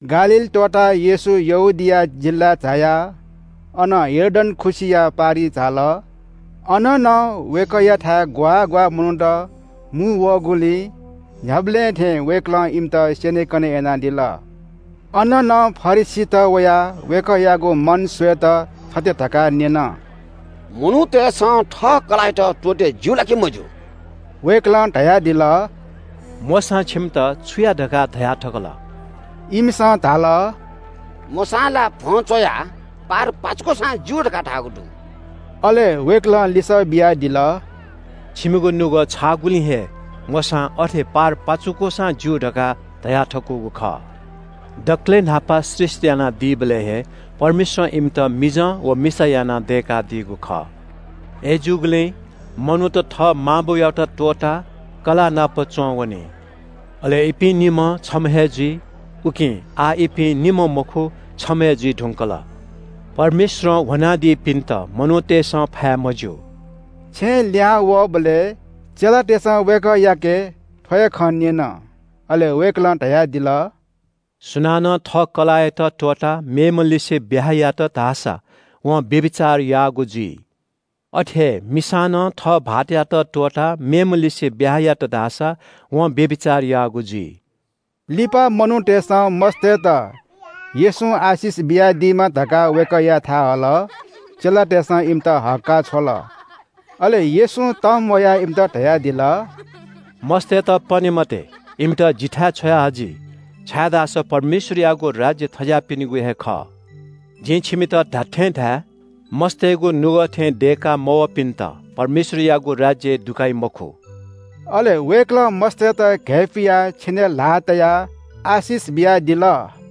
गालील त्‍वःताः येशू यहूदिया जिल्‍लाय् झायाः अनं यर्दन खुसिया पारिइ झाल। अन नं वय्‌कःयाथाय् ग्‍वाः ग्‍वाः मनूत मुंवःगुलिं न्‍ह्याबलें थें वय्‌कलं इमित स्‍यनेकने यानादिल। अन नं फरिसीत वयाः वय्‌कःयागु मन स्‍वयेत थथे धकाः न्‍यन – “मनूतय्‌सं थः कलाःयात त्‍वःते ज्‍यू ला कि मज्‍यू?” वय्‌कलं धयादिल – “मोशां छिमित छु या धकाः धया थकल?” इमिसं धाल – “मोशां ला भ्‍वं च्‍वयाः पारपाचुकूसां ज्‍यू धकाः धाःगु दु।” अले वय्‌कलं लिसः बियादिल – “छिमिगु नुगः छाःगुलिं हे मोशां अथे पारपाचुकूसां ज्‍यू धकाः धयाथकूगु खः। दकलय् न्‍हापा सृष्‍टि यानादीबलय् हे परमेश्‍वरं इमित मिजं व मिसा यानाः दय्‌कादीगु खः। अय्‌जूगुलिं मनूत थः मां बौयात त्‍वःताः कलाःनापं च्‍वंवनी। अले इपिं निम्‍हं छम्‍ह हे जुइ। उकिं आः इपिं निम्‍ह मखु, छम्‍ह हे जुइ धुंकल। परमेश्‍वरं ह्वनादीपिन्‍त मनूतय्‌सं फाये मज्‍यू।” छेँय् लिहां वःबलय् चेलातय्‌सं वय्‌कःयाके थ्‍व हे खँ न्‍यन। अले वय्‌कलं धयादिल – “सुनानं थः कलाःयात त्‍वःताः मेम्‍हलिसे ब्‍याहा यात धाःसा वं व्‍यभिचार याःगु जुइ। अथे हे मिसां नं थः भाःतयात त्‍वःताः मेम्‍हलिसे ब्‍याहा यात धाःसा वं व्‍यभिचार याःगु जुइ।” लिपा मनूतय्‌सं मस्‍तय्‌त येशूं आशिष बियादीमा धकाः वय्‌कःयाथाय् हल। चेलातय्‌सं इमित हक्‍काः छ्वल। अले येशूं तंम्‍वयाः इमित धयादिल – “मस्‍तय्‌त पने मते। इमित जिथाय् छ्वया हजि, छाय्‌धाःसा परमेश्‍वरयागु राज्‍य थज्‍याःपिनिगु हे खः। जिं छिमित धात्‍थें धाये – मस्‍तय्‌गु नुगः थें दय्‌का मवःपिन्‍त परमेश्‍वरयागु राज्‍यय् दुकाइ मखु।” अले वय्‌कलं मस्‍तय्‌त घय्‌पुयाः छेनय् ल्‍हाः तयाः आशिष बियादिल।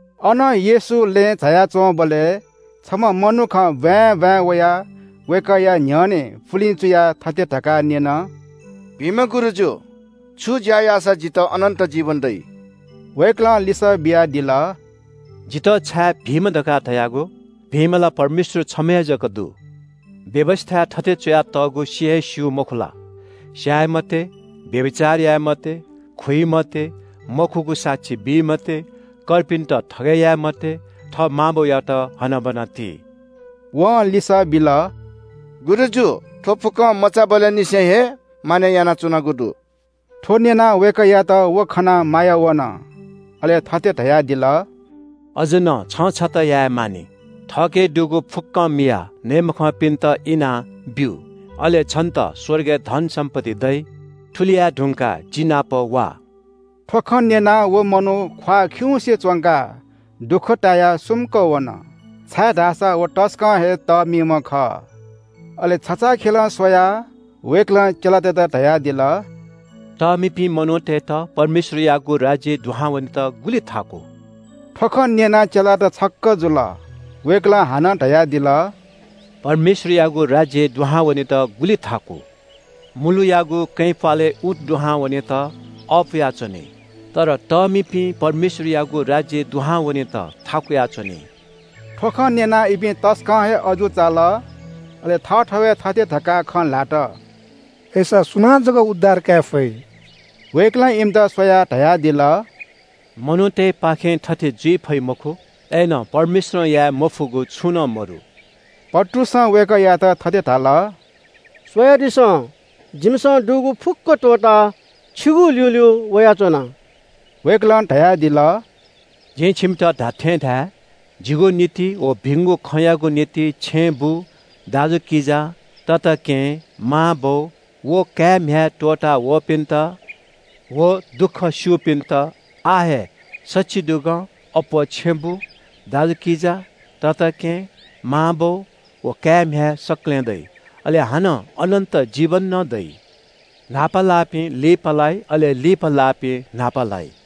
अनं येशू लँय् झाया च्‍वंबलय् छम्‍ह मनुखं ब्‍वाँय् ब्‍वाँय् वयाः वय्‌कःया न्‍ह्यःने पुलिं चुयाः थथे धकाः न्‍यन – “भिंम्‍ह गुरुजु, छु ज्‍या याःसा जितः अनन्‍त जीवन दइ?” वय्‌कलं लिसः बियादिल – “जितः छाय् भिंम्‍ह धकाः धयागु? भिंम्‍ह ला परमेश्‍वर छम्‍ह हे जक दु। व्‍यवस्‍थाय् थथे च्‍वयातःगु सि हे स्‍यू, मखु ला? स्‍याये मते, व्‍यभिचार याये मते, खुइ मते, मखुगु साक्षी बी मते, कर्पिन्‍त थगय् याये मते, थः मां बौयात हनाबना ति।” वं लिसः बिल – “गुरुजु, थ्‍व फुक्‍कं मचाबलय् निसें हे मानय् यानाच्‍वनागु दु।” थ्‍व न्‍यनाः वय्‌कःयात व खनाः माया वन, अले थथे धयादिल – “अझ नं छं छता याये मानि, थःके दुगु फुक्‍कं मियाः नये मखंपिन्‍त इनाब्‍यु। अले छन्‍त स्‍वर्गय् धनसम्‍पत्ति दइ। थुलि याये धुंकाः जि नाप वा।” थ्‍व खँ न्‍यनाः व मनू ख्‍वाः खिउँसे च्‍वंकाः दुःख तायाः सुम्‍क वन, छाय्‌धाःसा व तसकं हे तःमिम्‍ह खः। अले छचाःखेलं स्‍वयाः वय्‌कलं चेलातय्‌त धयादिल – “तःमिपिं मनूतय्‌त परमेश्‍वरयागु राज्‍यय् दुहां वनेत गुलि थाकु।” थ्‍व खँ न्‍यनाः चेलात छक्‍क जुल। वय्‌कलं हानं धयादिल – “परमेश्‍वरयागु राज्‍यय् दुहां वनेत गुलि थाकु। मुलुयागु कँय् प्‍वालय् ऊँट दुहां वनेत अःपुया च्‍वनी, तर तःमिपिं परमेश्‍वरयागु राज्‍यय् दुहां वनेत थाकुया च्‍वनी।” थ्‍व खँ न्‍यनाः इपिं तसकं हे अजू चाल, अले थःथवय् थथे धकाः खँ ल्‍हात – “अय्‌सा सुनां जक उद्धार काये फइ?” वय्‌कलं इमित स्‍वयाः धयादिल – “मनूतय्‌पाखें थथे जुइ फइ मखु, अय्‌नं परमेश्‍वरं याये मफुगु छुं नं मदु।” पत्रुसं वय्‌कःयात थथे धाल – “स्‍वयादिसँ, जिमिसं दुगु फुक्‍क त्‍वःताः छिगु ल्‍यूल्‍यू वयाच्‍वना।” वय्‌कलं धयादिल – “जिं छिमित धात्‍थें धाये – जिगु निंतिं व भिंगु खँयागु निंतिं छेँबुँ, दाजुकिजा, तताकेहेँ, मांबौ व काय्‌म्‍ह्याय् त्‍वःतावःपिन्‍त व दुःख स्‍यूपिन्‍त आः हे सछिदुगं अप्‍वः छेँबुँ, दाजुकिजा, तताकेहेँ, मांबौ व काय्‌म्‍ह्याय् सकलें दइ। अले हानं अनन्‍त जीवन नं दइ। न्‍हापा लाःपिं लिपा लाइ, अले लिपा लाःपिं न्‍हापा लाइ।”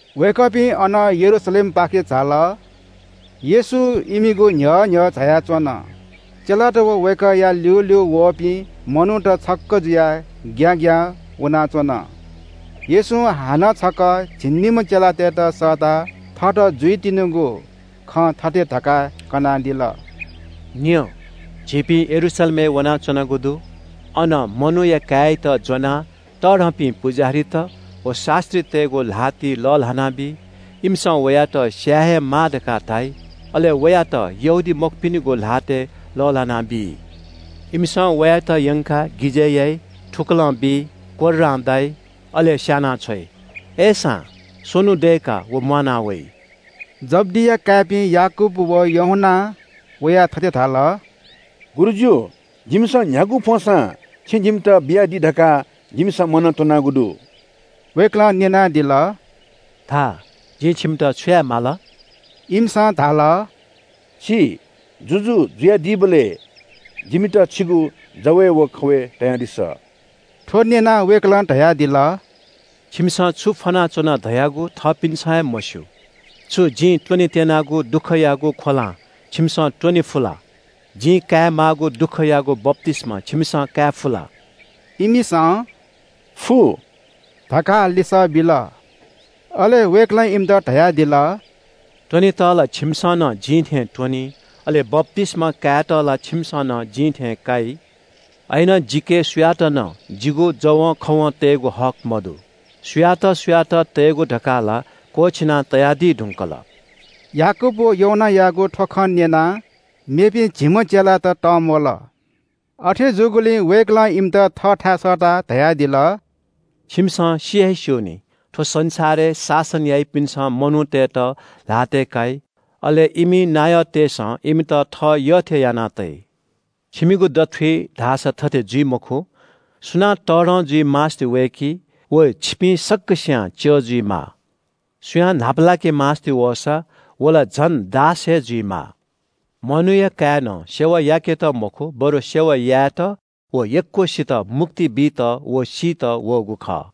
वय्‌कःपिं अनं यरूशलेमपाखे झाल। येशू इमिगु न्‍ह्यः न्‍ह्यः झायाच्‍वन। चेलात व वय्‌कःया ल्‍यूल्‍यू वःपिं मनूत छक्‍क जुयाः ग्‍याग्‍यां वनाच्‍वन। येशूं हानं छकः झिंनिम्‍ह चेलातय्‌त सःताः थःत जुइतिनिगु खँ थथे धकाः कनादिल – “न्‍यँ, झीपिं यरूशलेमय् वनाच्‍वनागु दु। अन मनूया काय्‌यात ज्‍वनाः तःधंपिं पुजाहारीत व शास्‍त्रीतय्‌गु ल्‍हातिइ लःल्‍हानाबी। इमिसं वयात स्‍याये हे माः धकाः धाइ। अले वयात यहूदीमखुपिनिगु ल्‍हातय् लःल्‍हानाबी। इमिसं वयात यंकाः गिजय् याइ, थुकलं बी, कोर्रां दाइ, अले स्‍यानाछ्वइ। अय्‌सां स्‍वन्‍हु दय्‌काः व म्‍वाना वइ।” जब्‍दिया काय्‌पिं याकूब व यूहन्‍नां वयाः थथे धाल – “गुरुजु, जिमिसं न्‍ह्यागु फ्‍वंसां छिं जिमित बियादी धकाः जिमिसं मनंतुनागु दु।” वय्‌कलं न्‍यनादिल – “धा, जिं छिमित छु याये माल?” इमिसं धाल – “छि जुजु जुयादीबलय् जिमित छिगु जवय् व खवय् तयादिसँ।” थ्‍व न्‍यनाः वय्‌कलं धयादिल – “छिमिसं छु फ्‍वनाच्‍वना धयागु थःपिन्‍सं हे मस्‍यू। छु जिं त्‍वनेत्‍यनागु दुःखयागु ख्‍वलां छिमिसं त्‍वने फु ला? जिं काये माःगु दुःखयागु बप्‍तिस्‍मा छिमिसं धायेफु ला?” इमिसं “फु” धकाः लिसः बिल। अले वय्‌कलं इमित धयादिल – “त्‍वनेत ला छिमिसं नं जिं थें त्‍वनी, अले बप्‍तिस्‍मा कायेत ला छिमिसं नं जिं थें काइ। अय्‌नं जिके सुयात नं जिगु जवंखवं तयेगु हक मदु। सुयात सुयात तयेगु धकाः ला क्‍वःछिना तयादी धुंकल।” याकूब व यूहन्‍नायागु थ्‍व खँ न्‍यनाः मेपिं झिम्‍ह चेलात तंम्‍वल। अथे जूगुलिं वय्‌कलं इमित थःथाय् सःताः धयादिल – “छिमिसं सि हे स्‍यू नि, थ्‍व संसारय् शासन याइपिन्‍सं मनूतय्‌त ल्‍हातय् काइ। अले इमि नायःतय्‌सं इमित थः यःथें याना तइ। छिमिगु दथुइ धाःसा थथे जुइ मखु। सुनां तःधं जुइ मास्‍ति वय्‌की व छिपिं सकसियां च्‍यः जुइमाः। सुयां न्‍हापालाके मास्‍ति वःसा व ला झन दास हे जुइमाः। मनूया काय्‌नं सेवा याकेत मखु, बरु सेवा यायेत व यक्‍वसित मुक्ति बीत व सीत वःगु खः।”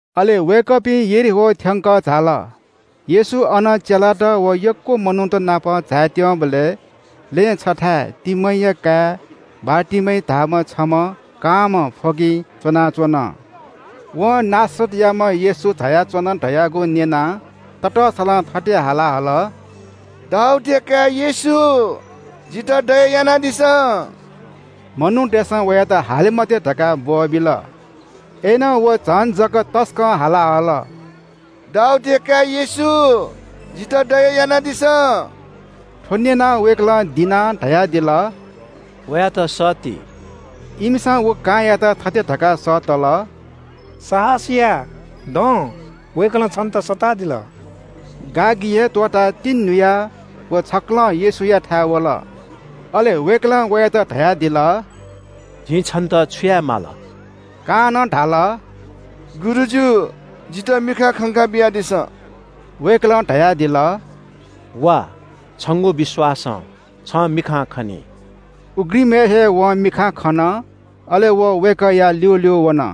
अले वय्‌कःपिं यरीहो थ्‍यंकः झाल। येशू अनं चेलात व यक्‍व मनूत नाप झायेत्‍यंबलय् लँय् छथाय् तिमैया काय् बारतिमै धाःम्‍ह छम्‍ह कांम्‍ह फ्‍वगिं च्‍वनाच्‍वन। वं नासरतयाम्‍ह येशू झायाच्‍वन धयागु न्‍यनाः ततःसलं थथे हाला हल – “दाऊदया काय् येशू, जितः दया यानादिसँ।” मनूतय्‌सं वयात हाले मते धकाः ब्‍वःबिल। अय्‌नं व झन जक तसकं हाला हल – “दाऊदया काय् येशू, जितः दया यानादिसँ।” थ्‍व न्‍यनाः वय्‌कलं दिनाः धयादिल – “वयात सःती।” इमिसं व कांयात थथे धकाः सःतल – “साहस या, दँ, वय्‌कलं छन्‍त सःतादिल।” गागि हे त्‍वःताः तिंन्‍हुयाः व छक्‍कलं येशूयाथाय् वल। अले वय्‌कलं वयात धयादिल – “जिं छन्‍त छु याये माल?” कांनं धाल – “गुरुजु, जितः मिखां खंका बियादिसँ।” वय्‌कलं धयादिल – “वा, छंगु विश्‍वासं छं मिखां खनी।” उघ्रिमय् हे वं मिखां खन, अले व वय्‌कःया ल्‍यूल्‍यू वन।